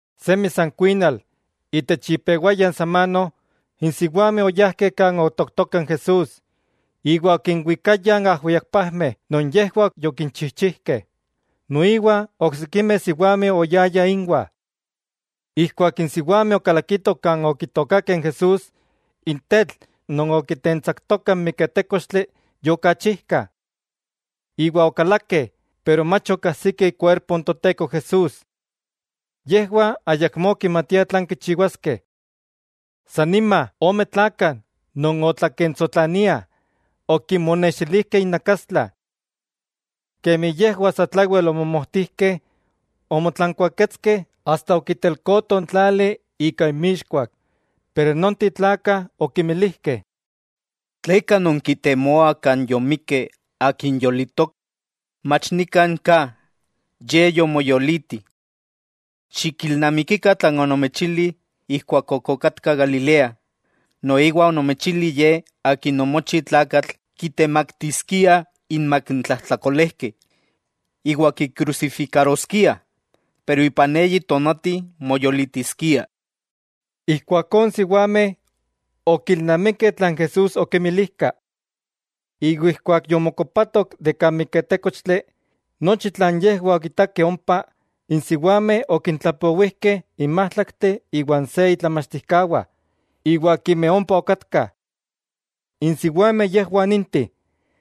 Semi san kuinal, itech ipewaya n samano, n siwameh oyajkeh kan otooktoka n Jesús, iwa okinwikayah ajwiakpajmeh non yejwah yokichijchijkeh, noiwa oksikimeh siwameh oyayah ínwah. Ijkuak n siwameh okalakitoh kan okitookakeh Jesús, n tetl non okitentsaktoka n miketékochtli yokachijka. Iwa okalakeh, pero mach okajsikeh ikuerpo n Toteko Jesús. Yejwah ayakmó okimatiah tlan kichiwaskeh. San nima ome tlakah non otlakentsotlaniah, okinmonextilijkeh innakastla. Kemi yejwah satlawel omomojtijkeh, omotlankuaketskeh asta okitelkotoh n tlali ika inmixkuak, pero nonteh tlakah okinmilijkeh: —¿Tleka nonkitemoah kan yomikkeh, Akin yolitok? Mach nikan ka, Ye yomoyoliti. Xikilnamikikah tlan onomechili ijkuak ok okatka Galilea, noiwa onomechili Ye Akin omochi tlakatl kitemaktiskiah inmak n tlajtlakolejkeh, iwa kikrusifikaroskiah, pero ipan eyi tonati moyolitiskia. Ijkuakó n siwameh okilnamikeh tlan Jesús okimilijka, iwa ijkuak yomokopatoh de kan miketékochtli, nochi tlan yejwah okitakeh ompa, n siwameh okintlapowijkeh n májtlakteh iwa n se itlamachtijkawah iwa akimeh ompa okatkah. N siwameh yejwah ninteh: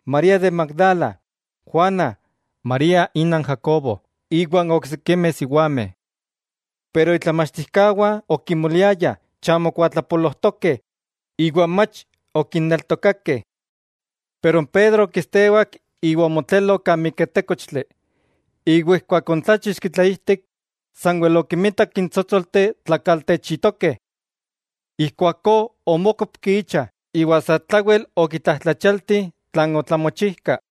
María de Magdala, Juana, María, ina n Jacobo, iwa n oksikimeh siwameh. Pero itlamachtijkawah okimoliayah chamo kuatlapolojtokeh, iwa mach okinneltokakeh. Pero n Pedro okistewak iwa omotlelo kan miketékochtli, iwa ijkuak oontláchixki tlaijtik, sanwel okimitak n tsótsolteh tlakaltechitokeh. Ijkuakó omókopki icha, iwa satlawel okitlajtlachialti tlan otlamochijka.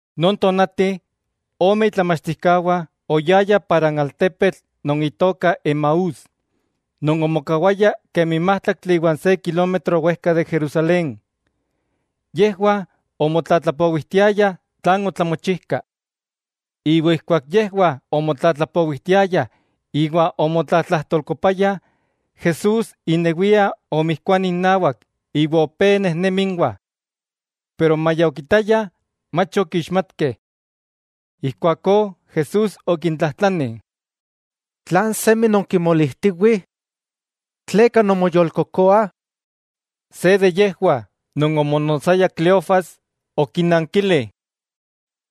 Non tonati, ome itlamachtijkawah oyayah para n altepetl non itoka Emaús, non omokawaya kemi májtlaktli iwa n se kilómetro wejka de Jerusalén. Yejwah omotlatlapowijtiayah tlan otlamochijka. Iwa ijkuak yejwah omotlatlapowijtiayah iwa omotlatlajtolkopayah, Jesús inewia omijkuani innawak iwa opé nejnemi ínwah. Pero maya okitayah, mach okixmatkeh. Ijkuakó Jesús okintlajtlani: —¿Tlan semi nonkimolijtiwih? ¿Tleka nonmoyolkokoah? Se de yejwah, non omonotsaya Cleofas, okinankili: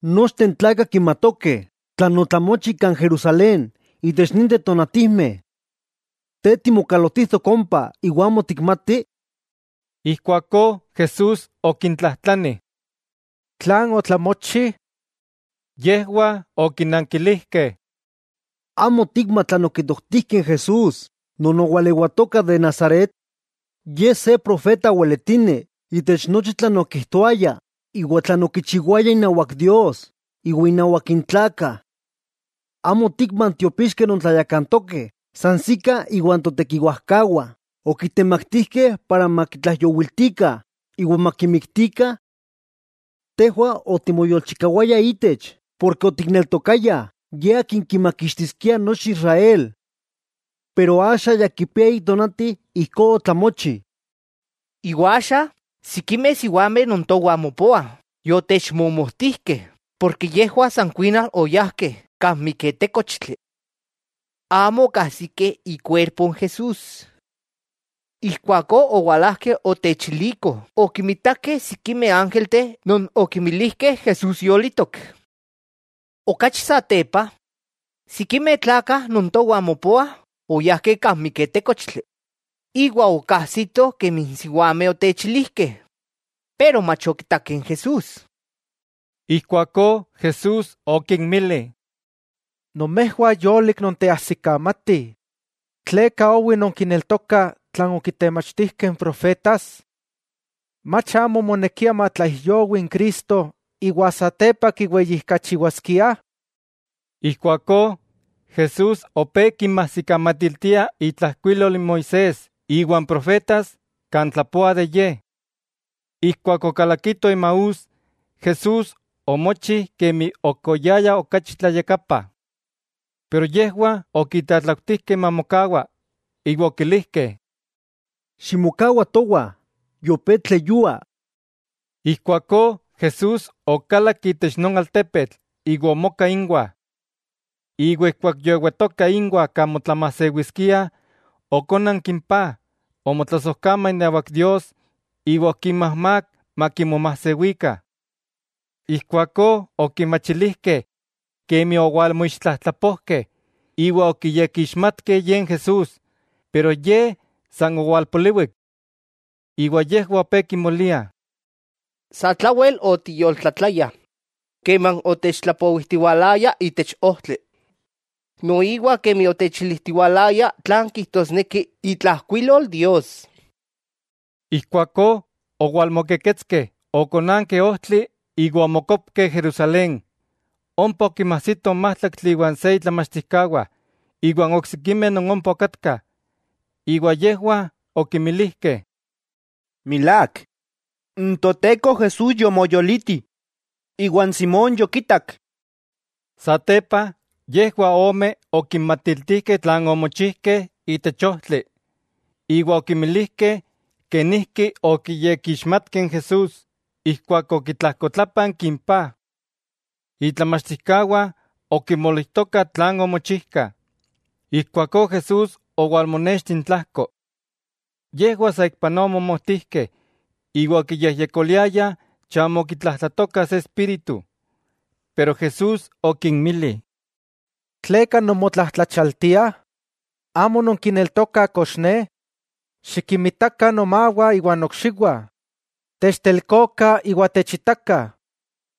—Nochteh n tlakah kimatokeh tlan otlamochi kan Jerusalén itech ninteh tonatijmeh. ¿Te timokalotijtok ompa iwa amo tikmati? Ijkuakó Jesús okintlajtlani: —¿Tlan otlamochi? Yejwah okinankilijkeh: —¿Amo otikma tlan okitoktijkeh n Jesús non owalewatoka de Nazaret? Ye se profeta weletini itech nochi tlan okijtoaya iwa tlan okichiwaya inawak Dios iwa innawak n tlakah. ¿Amo otikma n tiopixkeh non tlayakantokeh sansikah iwa n totekiwajkawah okitemaktijkeh para makitlaijyowiltikah iwa makimiktikah? Tejwah otimoyolchikawayah itech porke otikneltokayah Ye akin kimakixtiskia nochi Israel. Pero axa ya kipia eyi tonati ijkó otlamochi. Iwa axa, sikimeh siwameh non towah mopoah yotechmomojtijkeh, porke yejwah san kuinal oyajkeh kan miketékochtli. Amo okajsikeh ikuerpo Jesús. Ijkuakó owalajkeh otechilikoh okimitakeh sikimeh ángelteh non okimilijkeh Jesús yolitok. Okachi satepa, sikimeh tlakah non towah mopoah oyajkeh kan miketékochtli, iwa okajsitoh kemi n siwameh otechilijkeh, pero mach okitakeh n Jesús. Ijkuakó Jesús okinmili: —¡Nomejwah yolik nonteajsikamatih, tleka owi nonkineltokah tlan okitemachtijkeh n profetas! ¿Mach amo omonekia matlaijyowi n Cristo iwa satepa kiweyijkachiwaskiah? Ijkuakó Jesús opé kinmajsikamatiltia itlajkuilol n Moisés iwa n profetas kan tlapoah de Ye. Ijkuak okalakitoh Emaús, Jesús omochi kemi ok oyaya okachi tlayakapa. Pero yejwah okitlatlautijkeh mamokawa, iwa okilijkeh: —Ximokawa towah, yopé tleyua. Ijkuakó Jesús okalak itech non altepetl iwa omoka inwah. Iwa ijkuak yoewatoka inwah kan motlamajsewiskiah, okónanki n paj, omotlasojkama inawak Dios, iwa okinmajmák makimomajsewikah. Ijkuakó okimachilijkeh kemi owalmoixtlajtlapojkeh, iwa okiyekixmatkeh Ye n Jesús, pero Ye san owalpoliwik. Iwa yejwah opé kimoliah: —Satlawel otiyoltlatlayah keman otechtlapowijtiwalaya itech ojtli, noiwa kemi otechilijtiwalaya tlan kijtosneki itlajkuilol Dios. Ijkuakó, owalmokeketskeh okonankeh ojtli iwa omokopkeh Jerusalén; ompa okinmajsitoh n májtlaktli iwa n se itlamachtijkawah iwa n oksikimeh non ompa okatkah, iwa yejwah okimilijkeh: —Milák, n Toteko Jesús yomoyoliti, iwa n Simón yokitak. Satepa yejwah ome okinmatiltijkeh tlan omochijkeh itech ojtli, iwa okimilijkeh kenijki okiyekixmatkeh n Jesús ijkuak okitlajkotlápanki n paj. Itlamachtijkawah okimolijtokah tlan omochijkah, ijkuakó Jesús owalmonexti intlajko. Yejwah saikpanoa omomojtijkeh iwa okiyejyekoliayah chamo okitlajtlatokah se espíritu. Pero Jesús okinmili: —¿Tleka nonmotlajtlachialtiah? ¿Amo nonkineltokah kox Ne? Xikinmitakah nomawah iwa nokxiwah. Techtelkokah iwa techitakah;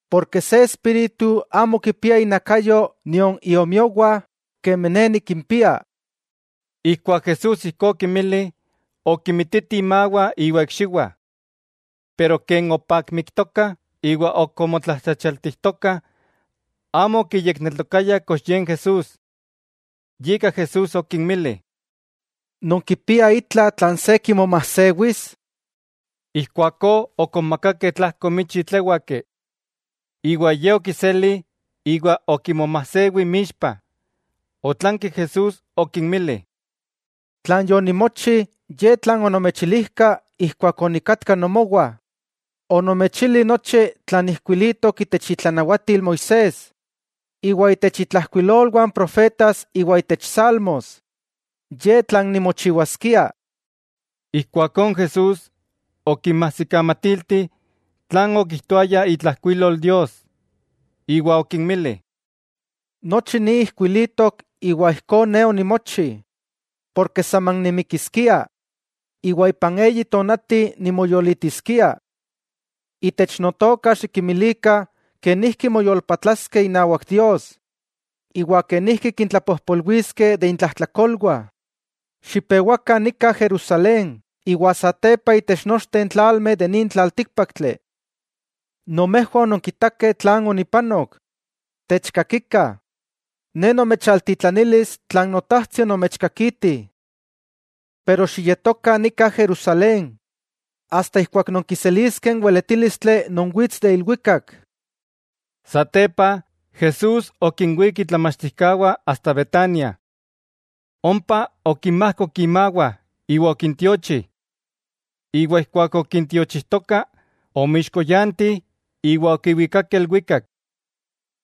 porke se espíritu amo kipia inakayo nion iomiowah kemi Ne nikimpia. Ijkuak Jesús ijkó okinmili, okimititih imawah iwa ikxiwah. Pero ken opakmiktokah iwa ok omotlajtlachialtijtokah, amo okiyekneltokayah kox Ye n Jesús, yika Jesús okinmili: —¿Nonkipiah itla tlan se kimomajsewis? Ijkuakó okonmakakeh tlajko michi tléwaki, iwa Ye okiseli iwa okimomajsewi inmixpah. Otlanki Jesús okinmili: —Tlan yonimochi ye tlan onomechilijka ijkuak onikatka nomowah. Onomechili nochi tlan ijkuilitok itech itlanawatil Moisés iwa itech intlajkuilolwah n profetas iwa itech salmos, ye tlan nimochiwaskia. Ijkuakó n Jesús okinmajsikamatilti tlan okijtoaya itlajkuilol Dios, iwa okinmili: —Nochi ni ijkuilitok iwa ijkó Ne onimochi, porke saman nimikiskia, iwa ipan eyi tonati nimoyolitiskia. Itech Notoka xikimilikah kenijki moyolpatlaskeh inawak Dios iwa kenijki kintlapojpolwiliskeh de intlajtlakolwah. Xipewakah nika Jerusalén iwa satepa itech nochteh tlalmeh de nin tlaltíkpaktli. Nomejwah ononkitakeh tlan onipanok. Techkakikah, Ne nomechaltitlanilis tlan Notajtsi onomechkakiti. Pero xiyetokah nika Jerusalén, asta ijkuak nonkiseliskeh n weletílistli non wits de ilwikak. Satepa, Jesús okinwík itlamachtijkawah asta Betania. Ompa okinmajkok imawah iwa okintiochi. Iwa ijkuak okintiochijtoka, omoixkoyanti iwa okiwikakeh ilwikak.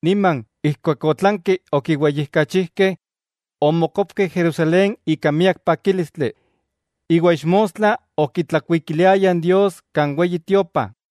Niman, ijkuak otlankeh okiweyijkachijkeh, omokopkeh Jerusalén ika miak pakílistli, iwa ixmostla okitlakuikiliayah Dios kan Weyi Tiopa.